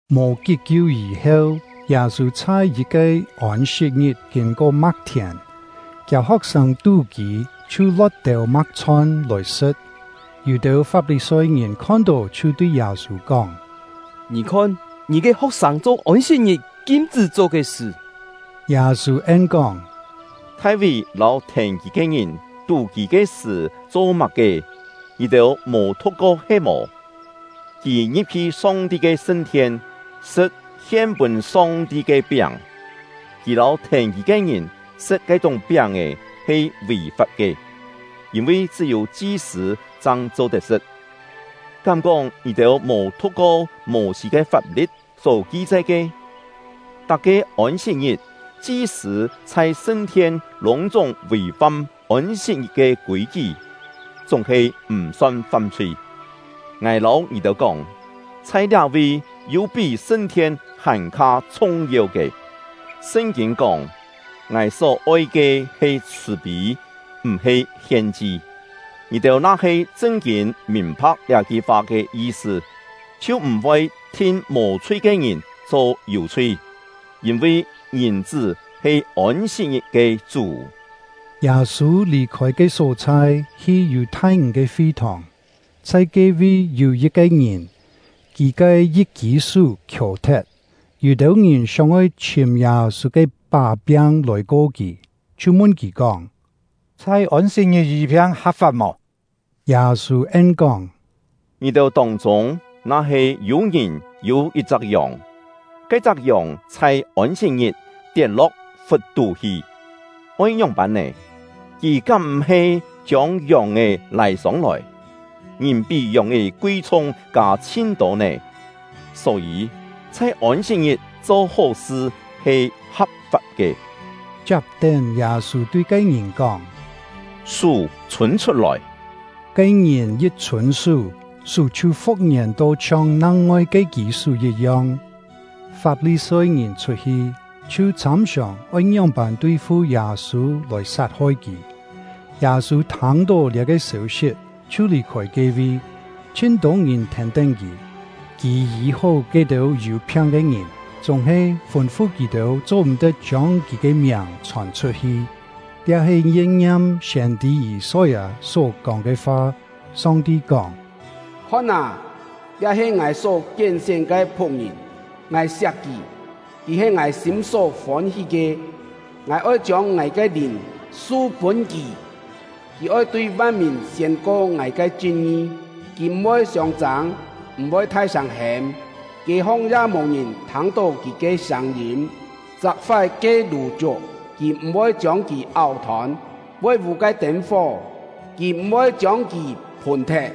Mò kí-kiú yî-heu, Yâ-sû chhai yit-ke Ôn-sit-ngit kîn-ko ma̍k-thièn. Kiâ ho̍k-sâng tú-kî, chhiu lo̍t têu ma̍k-chhon lòi sṳ̍t. Yû-têu Fap-li-soi-ngìn khon-tó chhiu tui Yâ-sû kóng: “Ngì khon, ngì ke ho̍k-sâng cho Ôn-sit-ngit kim-chṳ́ cho ke sṳ!” Yâ-sû en-kóng: “Thai-ví lâu thèn kì ke ngìn tú-kî ke sṳ̀ cho má-ke, ngì-têu mò thu̍k-ko he-mò? Kì ngi̍p-hi Song-ti ke sṳn-thien, sṳ̍t hien-pûn Song-ti ke piáng; kì lâu thèn kì ke ngìn sṳ̍t ke-chúng piáng-è he vì-fap ke, yîn-vi chṳ́-yû chi-sṳ̂ chang cho-tet sṳ̍t. Kám-kóng ngì-têu mò thu̍k-ko Mô-sî ke fap-li̍t só ki-chai ke? Tak-ke Ôn-sit-ngit, chi-sṳ̂ chhai sṳn-thien lûng-chúng vì-fam Ôn-sit-ngit ke kûi-kí, chúng-he m̀ son fam-chhui. Ngài lâu ngì-têu kóng, chhai liá-vi yû pí sṳn-thien hàn-kha chhung-yeu ke. Sṳn-kîn kóng: ‘Ngài só oi ke he chhṳ̀-pî, m̀-he hien-chi.’ Ngì-têu na-he chṳn-kîn mìn-pha̍k liá-ki fa ke yi-sṳ, chhiu m̀-voi thin mò-chhui ke ngìn cho yû-chhui. Yîn-vi Ngìn-chṳ́ he Ôn-sit-ngit ke Chú.” Yâ-sû lì-khôi ke só-chhai, hi Yù-thai-ngìn ke fi-thòng. Chhai ke-vi yû yit-ke ngìn, kì ke yit-kî sú khiò-thet. Yû-têu ngìn sióng-oi chhìm Yâ-sû ke pá-piang lòi ko kì, chhiu mun kì kóng: “Chhai Ôn-sit-ngit yî-phiang ha̍p-fap mò?” Yâ-sû en-kóng: “Ngì-têu tông-chûng, na-he yû-ngìn yû yit-chak yòng, ke-chak yòng chhai Ôn-sit-ngit tiet-lo̍k fut-tú hi, oi ngióng-pân nè? Kì kám m̀-he chiông yòng-è lâi sông-lòi? Ngìn pí yòng-è kui-chhung kâ chhin-tô nè! Só-yî, chhai Ôn-sit-ngit cho hó-sṳ he ha̍p-fap ke.” Chiap-tén, Yâ-sû tui ke-ngìn kóng: “Sú chhûn chhut-lòi!” Ke-ngìn yit chhûn-sú, sú chhiu fu̍k-ngièn to chhiong nang-ngoi ke-kî sú yit-yong. Fap-li-soi-ngìn chhut-hi, chhiu chhâm-siòng oi ngióng-pân tui-fu Yâ-sû lòi sat-hoi kì. Yâ-sû thâng-tó liá-ke sêu-sit, chhiu lì-khôi ke-vi, chhin-tô ngìn thèn-tén kì. Kì yî-hó ke-têu yû-phiang ke ngìn, chúng-he fûn-fu kì-têu, cho-m̀-tet chiông kì ke miàng chhòn chhut-hi. Liá he yin-ngiam siên-tî Yî-soi-â só-kóng ke fa: Song-ti kóng: “Khon nâ, liá he Ngài só kién-sién ke phu̍k-ngìn; Ngài siak kì, kì he Ngài sîm só fôn-hí ke. Ngài oi chiông Ngài ke Lìn su-pûn kì; kì oi tui van-mìn siên-ko Ngài ke chṳn-ngi. Kì m̀-voi siông-châng, m̀-voi thai-sâng hêm, kiê-hong ya mò-ngìn thâng-tó kì ke sâng-yîm. Chak-fái ke lù-chuk, kì m̀-voi chiông kì áu-thôn, voi vû ke tên-fó, kì m̀-voi chiông kì phùn-thet.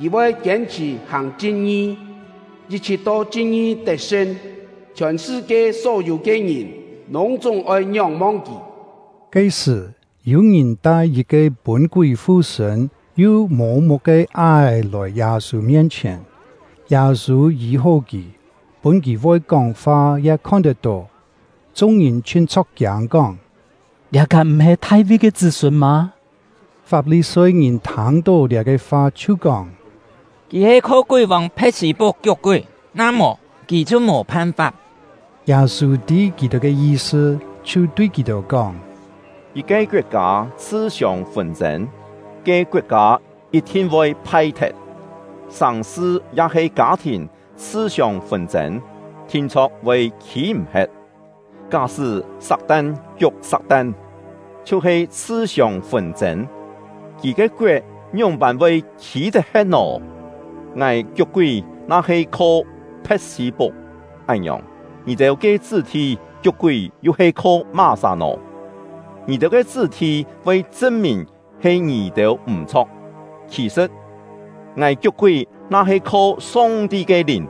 Kì voi kiên-chhṳ̀ hàng chṳn-ngi, yit-chhṳ̍t to chṳn-ngi tet-sṳn. Chhiòn sṳ-kie só-yû ke ngìn lûng-chúng oi ngióng-mong kì!” Ke-sṳ̀, yû-ngìn tai yit-ke pûn-kúi fu-sṳ̂n yu mô-muk ke á-è lòi Yâ-sû mien-chhièn. Yâ-sû yî-hó kì, pûn kì voi kóng-fa ya khon-tet-tó. Chung-ngìn chhin chho̍k-kiâng, kóng: “Liá kám m̀-he Thai-ví ke chṳ́-sûn mâ?” Fap-li-soi-ngìn thâng-tó liá-ke fa chhiu kóng: “Kì he kho kúi-vòng Phe̍t-sî-puk kiuk-kúi, na mò, kì chhiu mò phan-fap!” Yâ-sû tî kì-têu ke yi-sṳ, chhiu tui kì-têu kóng: “Yit-ke koet-kâ chhṳ-siông fûn-chên, ke koet-kâ yit-thin voi phai-thet; sàng-sṳ ya-he kâ-thìn chhṳ-siông fûn-chên, thin-chho̍k voi khî-m̀-he̍t. Ká-sṳ́ Sat-tan kiuk Sat-tan, chhiu-he chhṳ-siông fûn-chên, kì ke koet ngióng-pân voi khî tet-he̍t nò? Ngài kiuk-kúi na-he kho Phe̍t-sî-puk, án-ngiòng, ngì-têu ke chṳ́-thi kiuk-kúi yu he kho má-sà nò? Ngì-têu ke chṳ́-thi voi chṳn-mìn he ngì-têu m̀-chho̍k! Khì-sṳ̍t, ngài kiuk-kúi na-he kho Song-ti ke Lìn,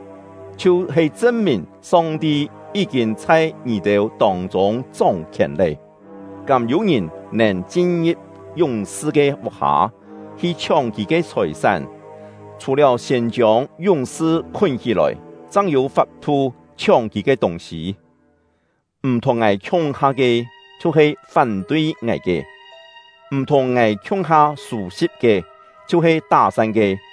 chhiu-he chṳn-mìn Song-ti yí-kîn chhai ngì-têu tông-chûng chóng-khièn lé. “Kám yû-ngìn nèn chin-ngi̍p yúng-sṳ ke vuk-hâ hi chhióng kì ke chhòi-sán? Chhù-liáu siên chiông yúng-sṳ khún hí-lòi, chang yû fap-thu chhióng kì ke tûng-sî. “M̀ thùng ngài khiung-ha ke, chhiu-he fán-tui ngài ke; m̀ thùng ngài khiung-ha sû-si̍p ke, chhiu-he tá-san ke.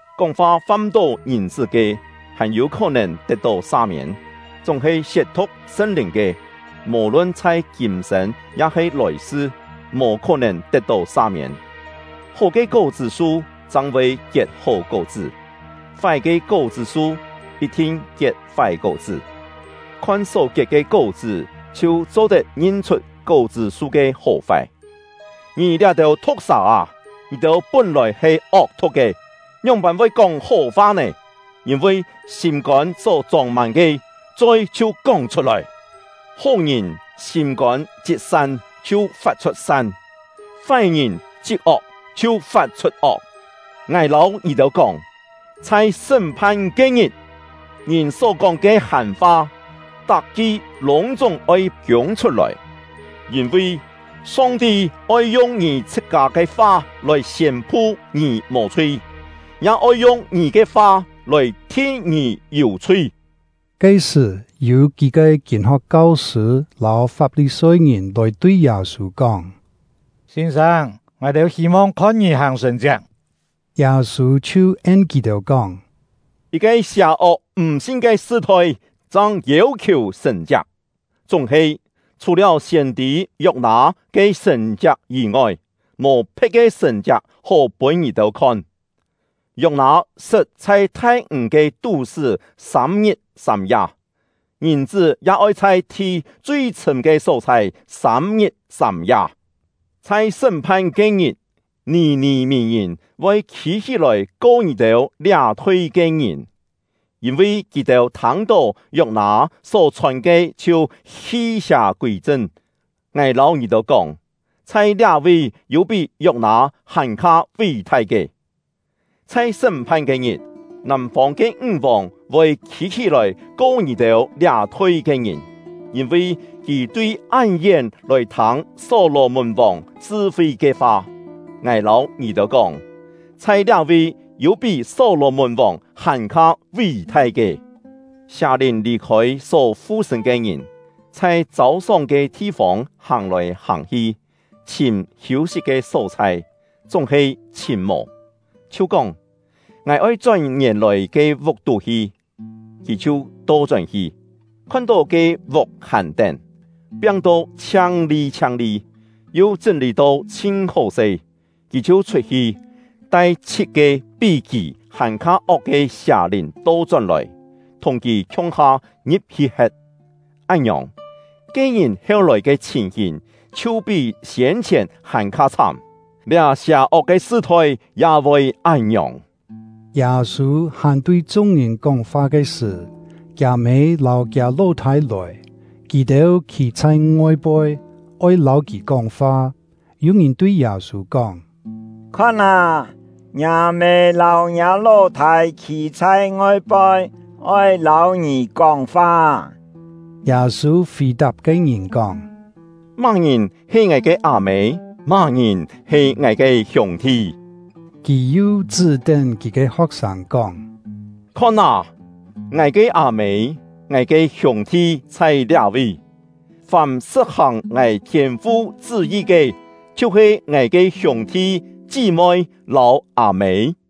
Kóng-fa fâm-tó Ngìn-chṳ́ ke, hàn-yû khó-nèn tet-tó sa-miên; chúng-he siet-thu̍k Sṳn-Lìn ke, mò-lun chhai kîm-sên ya-he lòi-sṳ, mò khó-nèn tet-tó sa-miên. “Hó ke kó-chṳ́-su chang voi kiet hó kó-chṳ́; fái ke kó-chṳ́-su yit-thin kiet fái kó-chṳ́. Khon só-kiet ke kó-chṳ́ chhiu cho-tet ngin-chhut kó-chṳ́-su ke hó-fái. Ngì liá-têu thu̍k-sà â! Ngì-têu pún-lòi he ok-thu̍k ke, ngióng-pân voi kóng hó-fa nè? Yîn-vi sîm-kôn só chông-mân ke, choi chhiu kóng chhut-lòi. Hó-ngìn sîm-kôn chit san chhiu fat-chhut san; fái-ngìn chit ok chhiu fat-chhut ok. “Ngài lâu ngì-têu kóng, chhai sṳ́m-phan ke-ngit, ngìn só-kóng ke hàn-fa, tak-ki lûng-chúng oi kiûng chhut-lòi. Yîn-vi, Song-ti oi yung ngì chhṳ-kâ ke fa lòi siên-pu ngì mò-chhui, ya oi yung ngì ke fa lòi thin ngì yû-chhui.” Ke-sṳ̀, yû kí-ke kîn-ho̍k kau-sṳ̂ lâu Fap-li-soi-ngìn lòi tui Yâ-sû kóng: “Sîn-sâng, ngài-têu hî-mong khon ngì hàng sṳ̀n-chiak.” Yâ-sû chhiu en kì-têu kóng: “Yit-ke sià-ok m̀-sin ke sṳ-thoi chang yêu-khiù sṳ̀n-chiak; chúng-he, chhù-liáu siên-tî Yok-nâ ke sṳ̀n-chiak yî-ngoi, mò phe̍t ke sṳ̀n-chiak hó pûn ngì-têu khon. Yok-nâ sṳt chhai thai-ǹg ke tú-sṳ́ sâm-ngit sâm-ya, Ngìn-chṳ́ ya oi chhai thi chui-chhṳ̂m ke só-chhai sâm-ngit sâm-ya. Chhai sṳ́m-phan ke-ngit, Nì-nì-mì-ngìn voi khî-hí-lòi ko ngì-têu liá-thoi ke ngìn, yîn-vi kì-têu thâng-tó Yok-nâ só-chhòn ke chhiu hi-sià kûi-chṳn. Ngài lâu ngì-têu kóng, chhai liá-vi yû pí Yok-nâ hàn-kha ví-thai ke. Chhai sṳ́m-phan ke-ngit, nàm-fông ke ńg-vòng voi khî-hí-lòi ko ngì-têu liá-thoi ke ngìn, yîn-vi kì tui án-yén lòi thâng Só-lò-mùn-vòng chṳ-fi ke fa. Ngài lâu ngì-têu kóng, chhai liá-vi yû pí Só-lò-mùn-vòng hàn-kha ví-thai ke. “Sià-lìn lì-khôi só fu-sṳ̂n ke ngìn, chhai châu-sóng ke thi-fông hàng-lòi hàng-hi, chhìm hiû-sit ke só-chhai, chúng-he chhìm mò, chhiu kóng: ‘Ngài oi chón ngièn-lòi ke vuk-tú hi.’ Kì chhiu to-chón hi, khon-tó ke vuk hàn-tén, piang-to chhiang-li chhiang-li, yu chṳ́n-lî to chhin hó-se. Kì chhiu chhut-hi, tai chhit-ke pí kì hàn-kha ok ke sià-lìn to-chón-lòi, thùng kì khiung-ha ngi̍p-hi he̍t. Án-ngiòng, ke-ngìn heu-lòi ke chhìn-hìn chhiu pí siên-chhièn hàn-kha chhám. Liá sià-ok ke sṳ-thoi ya voi án-ngiòng.” Yâ-sû hàn tui chung-ngìn kóng-fa ke sṳ̀, kiâ mê lâu kiâ ló-thâi lòi. Kì-têu khî chhai ngoi-poi, oi lâu kì kóng-fa. Yû ngìn tui Yâ-sû kóng: “Khon â, ngiâ mê lâu ngiâ ló-thâi khî chhai ngoi-poi, oi lâu ngì kóng-fa.” Yâ-sû fì-tap ke-ngìn kóng: “Má-ngìn he ngài ke â-mê? Má-ngìn he ngài ke hiûng-thi?” Kì yu chṳ́-tén kì ke ho̍k-sâng kóng: “Khon â, ngài ke â-mê, ngài ke hiûng-thi chhai liá-vi! Fàm sṳ̍t-hàng ngài Thiên-fu chṳ́-yi ke chhiu-he ngài ke hiûng-thi, chí-moi, lâu â-mê.”